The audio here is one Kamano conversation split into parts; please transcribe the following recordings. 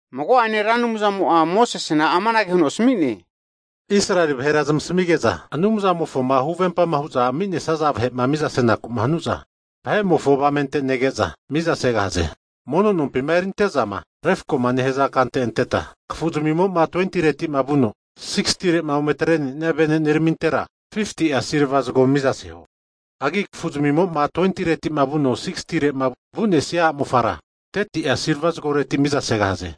Mago'ane Ra Anumzamo'a Mosesena amanage huno asami'ne, Israeli vahera zamasamige'za Anumzamofoma huvempa hu'za ami'nesaza vahe'ma mizama senaku'ma hanu'za, vahe'mofo avamente nege'za mizasegahaze. Mono nompima erinte'zama refkoma nehaza kante anteta, kafuzamimo'ma 20tireti'ma vuno, 60re'ma ometre'nenia veneneramintera 50'a silva zago mizaseho. Hagi kafuzmimo'ma 20reti'ma vuno 60re'ma vu'nesia a'mofara, 30'a silva zagoreti mizasegahaze.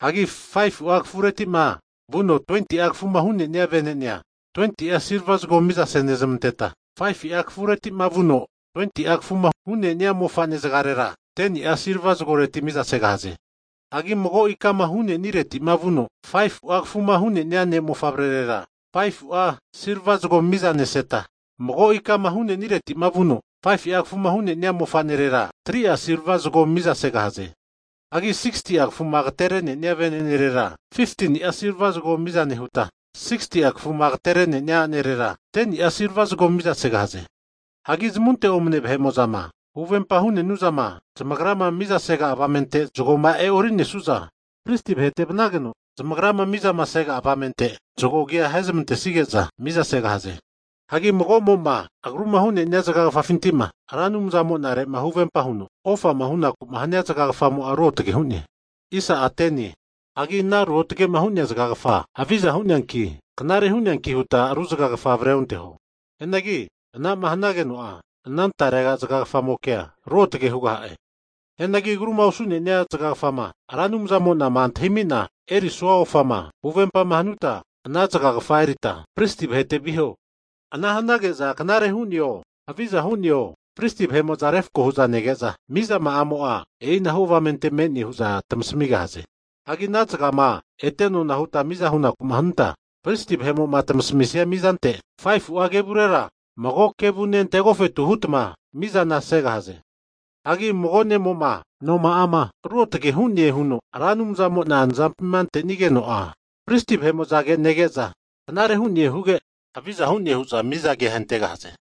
Hagi 5fu'a kafuretima vuno 20'a kafuma hu'nenia venene'a, 20'a silva zago mizase nezamanteta, 5fu'a kafuretima vuno 20'a kafuma hu'nenia mofane zagarera 10ni'a silva zagoreti mizasegahaze. Hagi mago ikama hu'neniretima vuno 5fu'a kafuma hu'nenia ne mofavrerera, 5'a silva zago mizaneseta, mago ikama hu'neniretima vuno 5fu'a kafuma hu'nenia mofanerera 3'a silva zago mizasegahaze. Hagi 6'a kafuma agaterenenia venenerera, 15tini'a silva zago miza nehuta, 60'a kafuma agatere'nenia anerera 10ni'a silva zago mizasegahaze. Hagi zamunte omane vahe'mo'zama huvempa hu'nenuzama zamagrama mizasega avamente zagoma e'ori'nesu'za, pristi vahete vanageno pristi vahe'mo zamagrama mizamasega avamente zago agi ahezamantesige'za mizasegahaze. Hagi mago'mo'ma agruma hu'nenia zagagafafinti'ma Ra Anumzamonare'ma huvempa huno ofama hu'naku'ma hania zagagafamo'a ruotage hu'ne. Hagi ana ruotage'ma hu'nea zagagafa haviza hu'neanki, knare hu'neanki nehuta ru zagagafa avreonteho. Hianagi anama hanageno'a, ana tarega zagagafamokea ruotage hugaha'e. Hianagi agruma osu'nenia zagagafama Ra Anumzamona'ma antahimina e'orisua ofama huvempama hanuta, ana zagagafa erita pristi vahete viho. Ana hanage'za knare hu'neo, haviza hu'neo pristi vahe'mo'za refako hu'za nege'za, mizama'amo'a e'inahu avamente me'ne hu'za tamasamigahaze. Hagi ana zagama ete nona huta miza huku'ma hanuta, pristi vahe'mo'ma tamasamisia mizante 5fu'a kevurera mago kevune ante agofetu hutma mizana asegahaze. Hagi mago ne'mo'ma noma'ama ruotage hu'ne huno Ra Anumzamo'na nazampima ante'nigeno'a, pristi vahe'mo'zage nege'za knare hu'ne huge, haviza hu'ne hu'za miza agia ahentegahaze.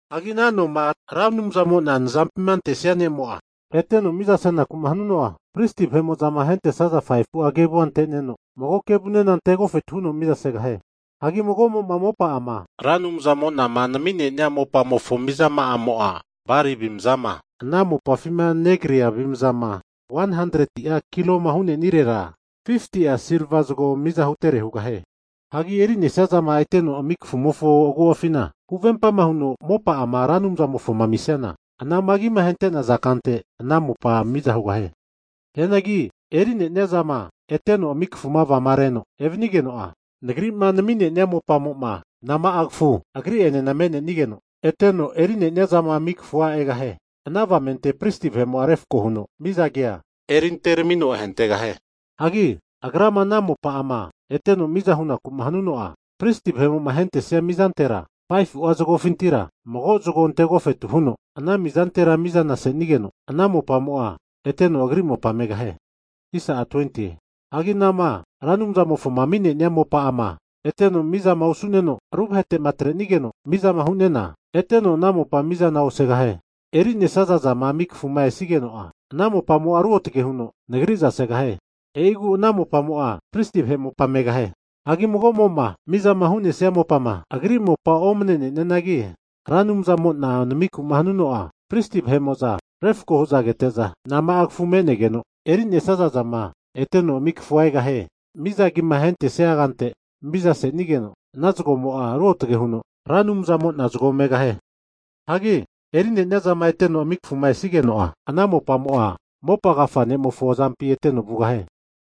Hagi ana noma Ra Anumzamo'na nazampima antesia ne'mo'ma eteno mizama senaku hanuno'a, pristi vahe'mo'zama ahentesaza 5fu'a kevua ante'neno, mago kevunena ante agofetu huno mizasegahie. Hagi mago'mo'ma mopa'ama Ra Anumzamo'na nami'nenia mopamofo mizama'amo'a, bali avimzama ana mopafima negria avimzama 100'a kiloma hu'nenirera 50tia silva zago miza hutere hugahie. Hagi erinesiazama eteno ami kafumofo agu'afima huvempa huno mopa'ama Ra Anumzamofoma amisiana, anama agima ahente'naza kante ana mopa miza hugahie. Hianagi eri'nenia zama eteno ami kafumo'ma vagareno evanigeno'a, Nagri'ma nami'nenia mopamo'ma nana kafu agri'enena me'nenigeno eteno eri'nenia zama ami kafua egahie, ana avamente pristi vahe'mo'a refko huno miza agi erinteramino ahentegahie. Hagi agrama ana mopa'ama eteno miza huku'ma hanuno'a, pristi vahe'mo'ma ahentesia mizantera 5fu'a zagofintira mago zago ante agofetu huno ana mizantera mizana asenigeno, ana mopamo'a eteno agri mopa megahie. Hagi anama Ra Anumzamofo ami'nenia mopa'ama eteno mizama osu'neno, ru vahetema atrenigeno mizama hu'nena, eteno ana mopa'a mizana osugahie. Hagi eri'nesia zama ami kafuma esigeno'a, ana mopamo'a ruotage huno Nagri'za segahie. E'igu ana mopamo'a pristi vahe mopa megahie. Hagi mago vahe'mo'ma mizama hu'nesia mopama agri mopa omanene'nianagi, Ra Anumzamo'na namiku'ma hanige'za, pristi vahe'mo'za refko hu'za kete'za, nama'a kafu me'nenigeno eri'nesia zama eteno ami kafua egahie, miza agima ahentesia kante mizasenigeno, ana zagomo'a ruotge huno Ra Anumzamo'na zago megahie. Hagi eri'neniazama eteno ami kafuma esigeno'a, ana mopamo'a, mopa agafa ne'mofo azampi eteno vugahie.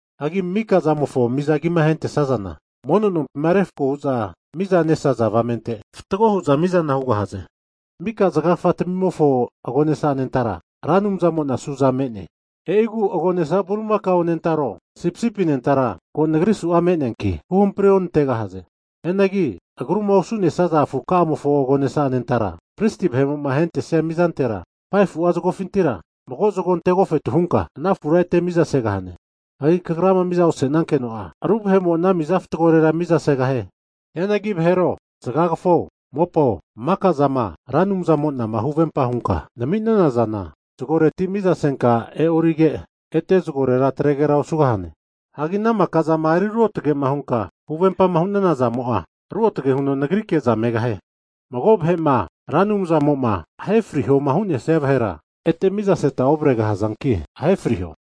Hagi mika'a zamofo miza agima ahentesazana, mono nompima refko hu'za mizama nesaza avamente fatgo hu'za mizana hugahaze. Mika'a zagagafa tamimofo agonesa anentara Ra Anumzamo'na su'za me'ne. E'igu' agonesa bulimakao anentaro, sipisipi anentara ko Nagri su'a me'neanki huhampri onantegahaze. Hianagi agruma osu'nesaza afuka'amofo agonesa anentara pristi vahe'mo'ma ahentesia mizantera 5fu'a zagofintira mago zago ante agofetu hunka, ana afura ete miza segahane. Hagi kagrama miza osenankeno'a, ru vahe'mo ana miza fatgore mizasegahie. Hianagi vahero, zagagafao, mopao, maka'zama Ra Anumzamona'ma huvempa hunka nami'nenana zana, zagoreti mizasenka e'orige, ete zagorera atregera osugahane. Hagi ana mika'zama eri ruotage'ma hunka huvempa hunana zamo'a, ruotage huno Nagrike'za megahie. Mago vahe'ma Ra Anumzamo'ma ahe frihoma hu'nesia vahera, ete mizaseta ovregahazanki ahe friho.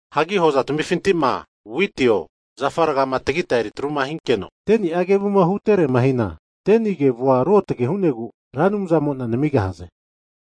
Hagi hoza tamifinti'ma witio, zafa rgama tagita eri atruma hinkeno 10ni'a kevuma huterema hina, 10ni kevua ruotage hu'negu Ra Anumzamo'na namigahaze.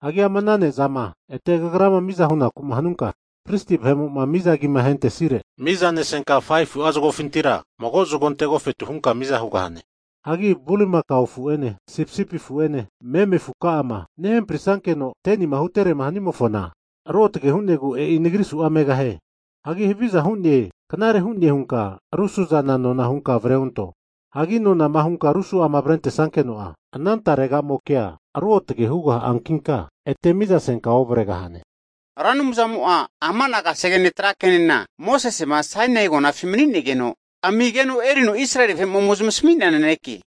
Hagi ama ana ne'zama ete kagrama miza hunaku'ma hanunka, pristi vahe'mo'ma miza agima ahentesire mizanesenka 5fu'a zagofintira mago zago ante agofetu hunka miza hugahane. Hagi bulimakao afu'ene, sipisipi afu'ene, meme afu ka'ama nehampri' nankeno'ma 10nima huterema hanimofona ruotage hu'negu, e'i Nagri su'za megahie. Hagi haviza hu'ne knare hu'ne hunka ru su'zana nona hunka avre onto. Hagi nonama hunka ru su'zama avrentesankeno'a, ana taregamokea ruotage hugaha'ankinka, ete mizasenka ovregahane. Ra Anumzamo'a amana kasegene tra kenena Mosese'ma Sainai agonafi mani'negeno amigeno erino Israeli vahe'ma ome zmasami'nea naneke.